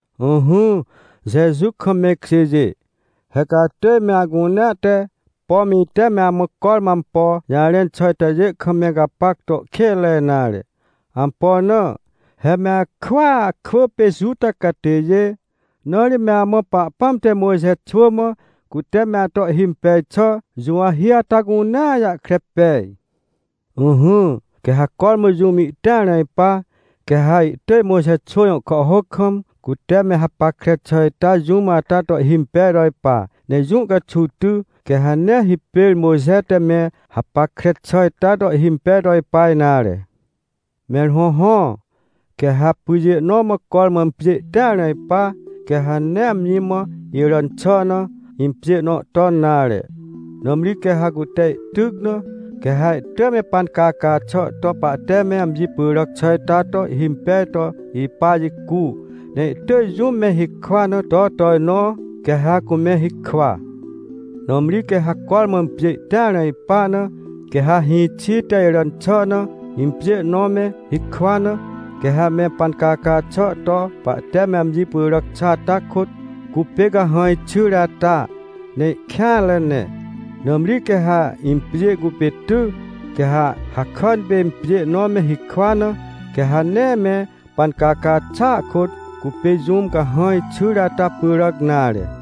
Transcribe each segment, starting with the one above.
Ỹhỹ, Jeju kam me ikjêjê, he ca atỳj me acunea te, pom ite me amã cormã ampo jarẽn xà itajê kam me gapac to kênre nare. Ampo na? He me akwỳa kwỳ pê Juta catêjê, na ri me amã Pahpãm te Mojxe xwỳ mã, cute me ato ihhimpej xà juwahi ata cunea jahkre pej. Ỹhỹ, quê ha cormã jũm ihtĩar na ipa, quê ha ihtỳj Mojxe xwỳ jõ kàhhôc kam, cute me hapackre xà ita jũm ata to ihhimpej to ipa. Ne jũ caxuw ty, quê ha nee hipêr Mojxe te me hapackre xà ita to ihhimpej to ipa nare. Mẽr hõhõ, quê ha pyjê nõ mã cormã impjê ihtĩar na ipa, quê ha nee amji mã iràn xà na impjê nõ ton nare. Nãmri quê ha cute ihtyc na, quê ha ihtỳj me pancaca xà to pahte me amji pyràc xà ita to ihhimpej to ipa jicu, ne ihtỳj jũm me hikwa na to tojnõ, quê ha cume hikwa. Nãmri quê ha cormã impjê ihtĩar na ipa na, quê ha hĩxi te iràn xà na impjê nõ me hikwa na, quê ha me pancaca xà to pahte me amji pyràc xà ata kôt cupê cahãj xyre ata, ne ihkêanre ne. Nãmri quê ha impjê cupê ty, quê ha hakàn pê impjê nõ me hikwa na, quê ha nee me pancaca xàa kôt cupê jũm cahãj xyre ata pyràc nare.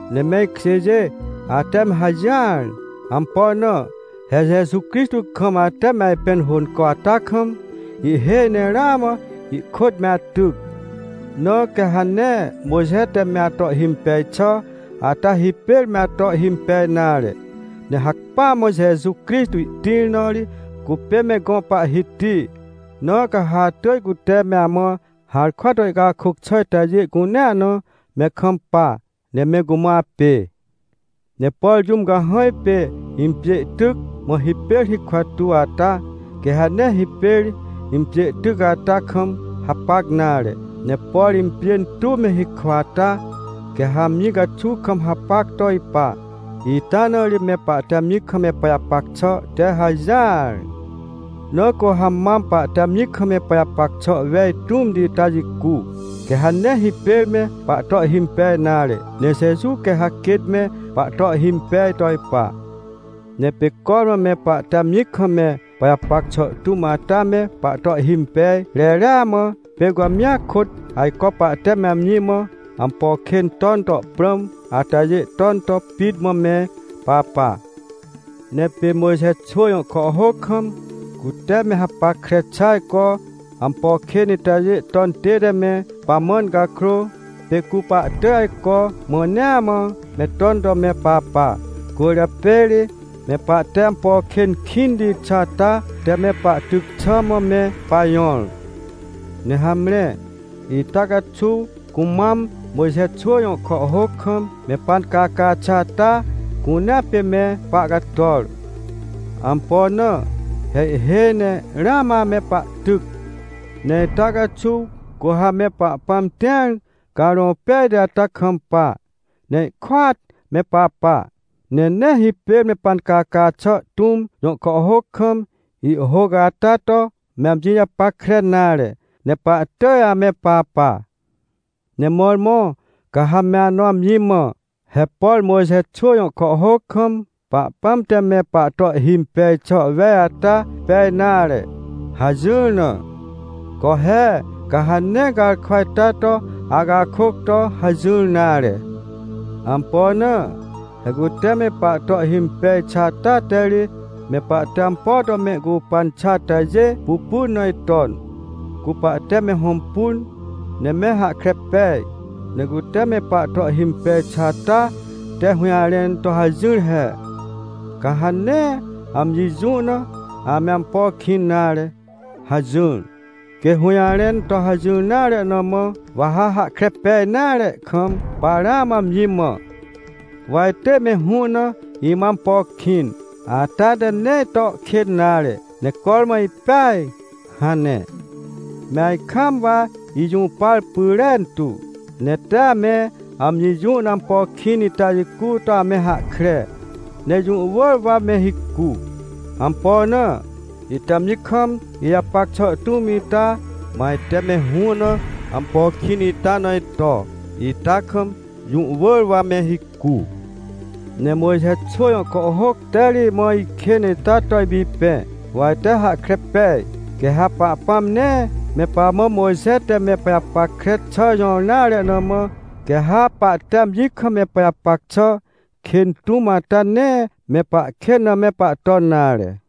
Ne me ikjêjê, ate me hajỹar. Ampo na? He Jeju Crixtô kam ate me ajpẽn hônco ata kam, ihhêj ne ramã ihkôt me atyc. Na quê ha nee Mojxe te me ato ihhimpej xà ata hipêr me ato ihhimpej nare. Ne hacpỹa mã Jeju Crixtô ihtĩr na ri cupê me gõ Pahhiti. Na ca ha atỳj cute me amã harkwa to ihcakôc xà itajê cunea na me kampa, ne me cumã apê. Ne por jũm cahãj pê impjê ihtyc, mã hipêr hikwa tuw ata, quê ha nee hipêr impjê tyc ata kam hapac nare. Ne por impjên tuw me hikwa ata, quê ha amji caxuw kam hapac to ipa. Ita na ri me pahte amji kam me pajapac xà te hajỹar. Na cu ha mam pahte amji kam me pajapac xà wej tũmti ita jicu, quê ha nee hipêr me pahto ihhimpej nare, ne Jeju quê ha quêt me pahto ihhimpej to ipa. Ne pê cormã me pahte amji kam me pajapac xà tũm ata me pahto ihhimpej reria mã, pê cu amjia kôt ajco pahte me amji mã ampo kên ton to prãm atajê ton to pit mã me papa. Ne pê Mojxe xwỳ jõ kàhhôc kam, cute me hapackre xà ajco ampo kên itajê ton tête me pamãn cakrô, pê cu pahtỳj ajco mãnea mã me ton to me papa. Cwỳrjapê ri me pahte ampo kên kĩnti xà ata te me pahtyc xà mã me pajõr. Ne hamre, ita caxuw cumam Mojxe xwỳ jõ kàhhôc kam me pancaca xà ata cunea pê me pahcator. Ampo na? He ihhêj ne ramã ame pahtyc. Ne ita caxuw cu ha me Pahpãm tĩar Carõ Pejti ata kampa, ne ihkôat me papa, ne nee hipêr me pancaca xà tũm jõ kàhhôc kam ihhôc ata to me amji japackre nare, ne pahtỳj ame papa. Ne mõrmõ ca ha me anõ amji mã: — He por Mojxe xwỳ jõ kàhhôc kam, Pahpãm te me pahto ihhimpej xà wej ata pej nare — hajỹr na. Co he! Ca ha nee garkwa ita to acakôc to hajỹr nare. Ampo na? He cute me pahto ihhimpej xà ata te ri, me pahte ampo to mehcupan xà atajê pupun na iton, cu pahte me hõmpun, ne me hahkre pej. Ne cute me pahto ihhimpej xà ata te hũjarẽn to hajỹr he: — Ca ha nee amji jũ na ame ampo kĩn nare — hajỹr. Quê hũjarẽn to hajỹr nare na mã, wa ha hahkre pej nare kam, pa ramã amji mã: — Wa itỳj me hũ na imã ampo kĩn, ata te nee ito ikên nare, ne cormã ipeaj — hane. Me ajkaam wa ijũpar pyrentu, ne tee ame amji jũ na ampo kĩn ita jicu to ame hahkre, ne jũ wỳr wa me hicu. Ampo na? Ite amji kam ijapac xà tũm ita, ma ite me hũ na ampo kĩn ita na ito, ita kam jũ wỳr wa me hicu. Ne Mojxe xwỳ jõ kàhhôc te ri imã ikên ita to ipipẽ, wa ite hahkre pej. Quê ha Pahpãm nee me pamã Mojxe te me pajapackre xà jõr nare na mã, quê ha pahte amji kam me pajapac xà kên tũm ata nee me pahkên na me pahton nare.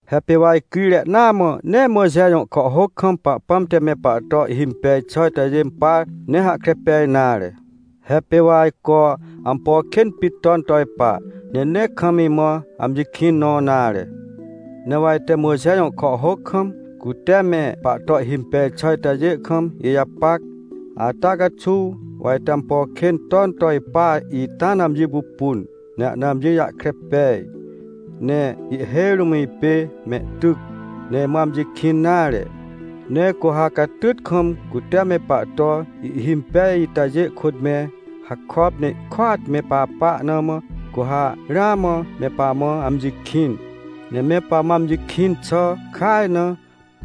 He pê wa icrire naa mã nee Mojxe jõ kàhhôc kam Pahpãm te me pahto ihhimpej xà itajê impar, ne hahkre pej nare. He pê wa ajco ampo kên pit ton to ipa, ne nee kam imã amji kĩn nõ nare. Ne wa ite Mojxe jõ kàhhôc kam, cute me pahto ihhimpej xà itajê kam ijapac, ata caxuw wa ite ampo kên ton to ipa ita na amji pupun, ne ahna amji jahkre pej. Ne ihhêj rũm ipê mehtyc, ne imã amji kĩn nare. Ne cu ha catyt kam cute me pahto ihhimpej itajê kôt me hakop, ne ihkôat me papa na mã, cu ha ramã me pamã amji kĩn. Ne me pamã amji kĩn xà kaj na,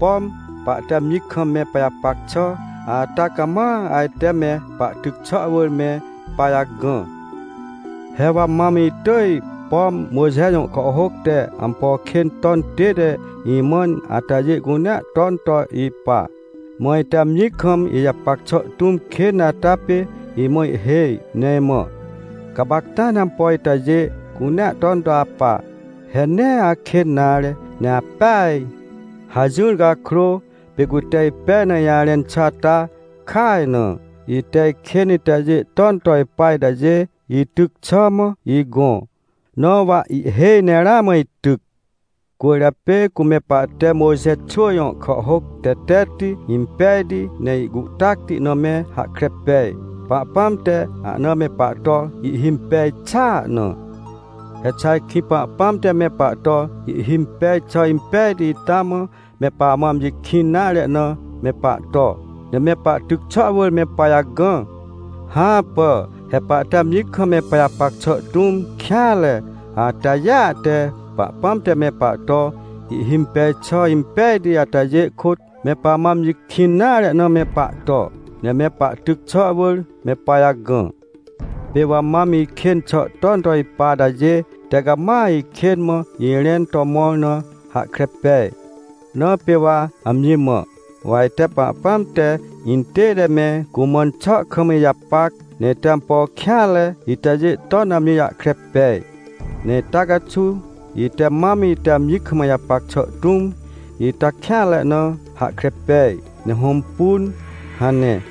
pom pahte amji kam me pajapac xà ata cama ajte me pahtyc xà wỳr me pajagã. He wa mam itỳj, pom Mojxe jõ kàhhôc te ampo kên ton tête imãn atajê cunea ton to ipa. Mã ite amji kam ijapac xà tũm kên ata pê imã ihhêj, ne imã: — Gapacta ne ampo itajê cunea ton to apa, he nee akên nare, ne apeaj — hajỹr cakrô, pê cute ipej na ijarẽn xà ata kaj na, ite ikên itajê ton to ipa itajê ityc xà mã igõ. Na wa ihhêj ne ramã ityc. Cwỳrjapê cu me pahte Mojxe xwỳ jõ kàhhôc tetetti, impejti ne ihcuhtacti na me hahkre pej, Pahpãm te ahna me pahto ihhimpej xàa na. He xà ajkĩ Pahpãm te me pahto ihhimpej xà impejti ita mã me pamã amji kĩn nare na me pahto, ne me pahtyc xà wỳr me pajagã? Hãpà. He pahte amji kam me pajapac xà tũm kêanre atajêa te, Pahpãm te me pahto ihhimpej xà impejti atajê kôt, me pamã amji kĩn nare na me pahto, ne me pahtyc xà wỳr me pajagã. Pê wa mam ikên xà ton to ipa atajê te cama ikên mã irẽn to mõr na hahkre pej. Na pê wa amji mã: — Wa ite Pahpãm te intête me cumãn xà kam ijapac, ne ite ampo kêanre itajê ton na amji jahkre pej. Ne ita caxuw ite mam ite amji kam ijapac xà tũm ita kêanre na hahkre pej, ne hõmpun — hane.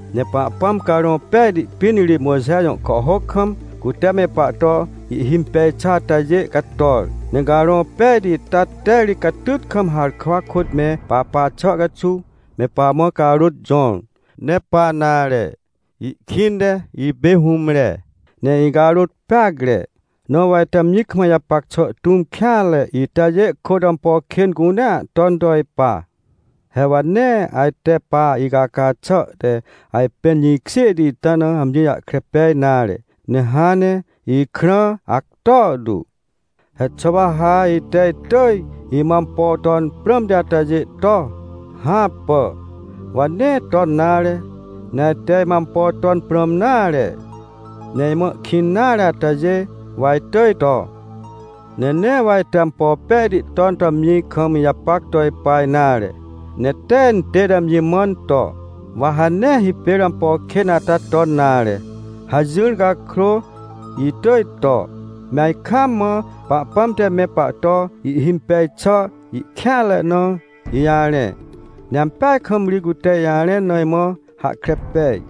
Ne Pahpãm Carõ Pejti pĩn ri Mojxe jõ kàhhôc kam, cute me pahto ihhimpej xà atajê cator. Ne Carõ Pejti ita te ri catyt kam harkwa kôt me papa xà caxuw, me pamã carôt jõr. Ne pa nare. Ihkĩnte ipê hũmre, ne icarôt peacre, na wa ite amji kam ijapac xà tũm kêanre itajê kôt ampo kên cunea ton to ipa. He wa nee ajte pa icaca xà te ajpẽn jĩkjêhti ita na amji jahkre pej nare, ne hãn ne ikrã acto tu. He xà wa ha ite itỳj imã ampo ton prãmti atajê to? Hãpà! Wa nee ton nare. Ne ajte imã ampo ton prãm nare, ne imã ihkĩn nare atajê, wa itỳj to. Ne nee wa ajte ampo pejti ton to amji kam ijapac to ipa nare, ne tee intête amji mãn to: — Wa ha nee hipêr ampo kên ata ton nare — hajỹr cakrô, itỳj to, me ajkaam mã Pahpãm te me pahto ihhimpej xà, ikêanre na ijarẽ. Ne ampeaj kam ri cute ijarẽn na imã hahkre pej.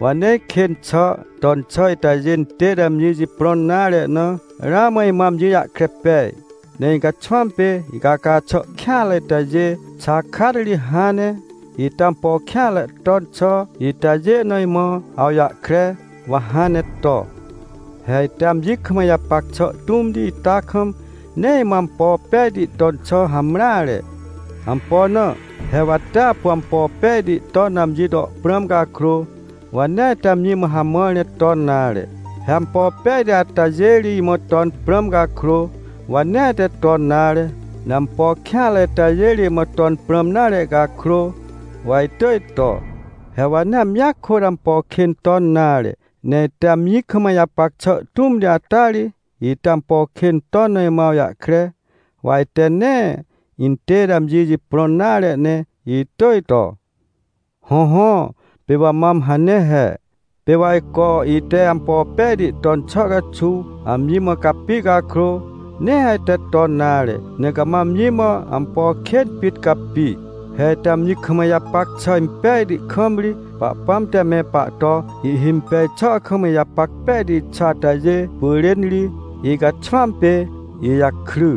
Wa nee ikên xà ton xà itajê intête amji jiprõn nare na, ramã imã amji jahkre pej. Ne icaxwãm pê icaca xà kêanre itajê xakat ri hãn ne, ite ampo kêanre ton xà itajê na imã awjahkre, wa hãn ne to. He ite amji kam ijapac xà tũmti ita kam, nee imã ampo pejti ton xà hamreare. Ampo na? He wa tee apu ampo pejti ton na amji to prãm cakrô, wa nee ajte amji mã hamãr ne ton nare. He ampo pejti atajê ri imã ton prãm cakrô, wa nee ajte ton nare. Ne ampo kêanre itajê ri imã ton prãm nare cakrô, wa itỳj to. He wa nee amjia kôt ampo kên ton nare, ne ite amji kam ijapac xà tũmti ata ri, ite ampo kên ton na imã awjahkre, wa ajte nee intête amji jiprõn nare ne itỳj to. Hõhõ, pê wa mam hane he, pê wa ajco ite ampo pejti ton xà caxuw amji mã capi cakrô, nee ajte ton nare, ne cama amji mã ampo kên pit capi. He ite amji kam ijapac xà impejti kam ri, Pahpãm te me pahto ihhimpej xà kam ijapac pejti xà atajê pyrên ri, icaxwãm pê ijakry.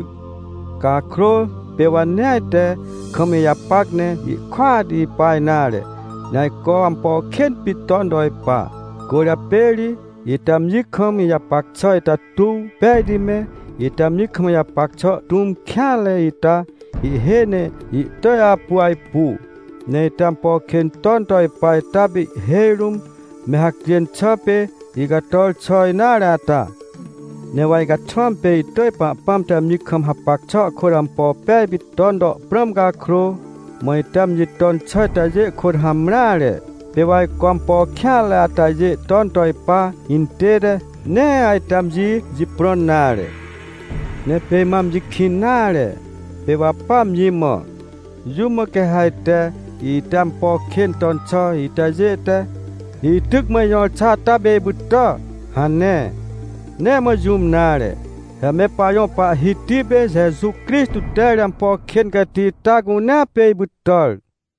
Cakrô pê wa nee ajte kam ijapac ne ihkôat ipa nare, ne ajco ampo kên pit ton to ipa. Cwỳrjapê ri ite amji kam ijapac xà ita tuw pejti me, ite amji kam ijapac xà tũm kêanre ita ihhêj ne ihtỳj apu ajpu. Ne ite ampo kên ton to ipa ita pê ihhêj rũm, me hacjên xà pê icator xà nare ata. Ne wa icaxwãm pê itỳj Pahpãm te amji kam hapac xà kôt ampo pej pit ton to prãm cakrô, mã ite amji ton xà itajê kôt hamreare. Pê wa ajco ampo kêanre atajê ton to ipa intête, nee ajte amji jiprõn nare. Ne pê imã amji kĩn nare, pê wa pa amji mã: — Jũm mã quê ha ajte ite ampo kên ton xà itajê te, ityc mã ijõr xà ata pê ipytà? — hane. Nee mã jũm nare. He me pajõ Pahhiti pê Jeju Crixtô te ri ampo kên cati ita cunea pê ipytàr!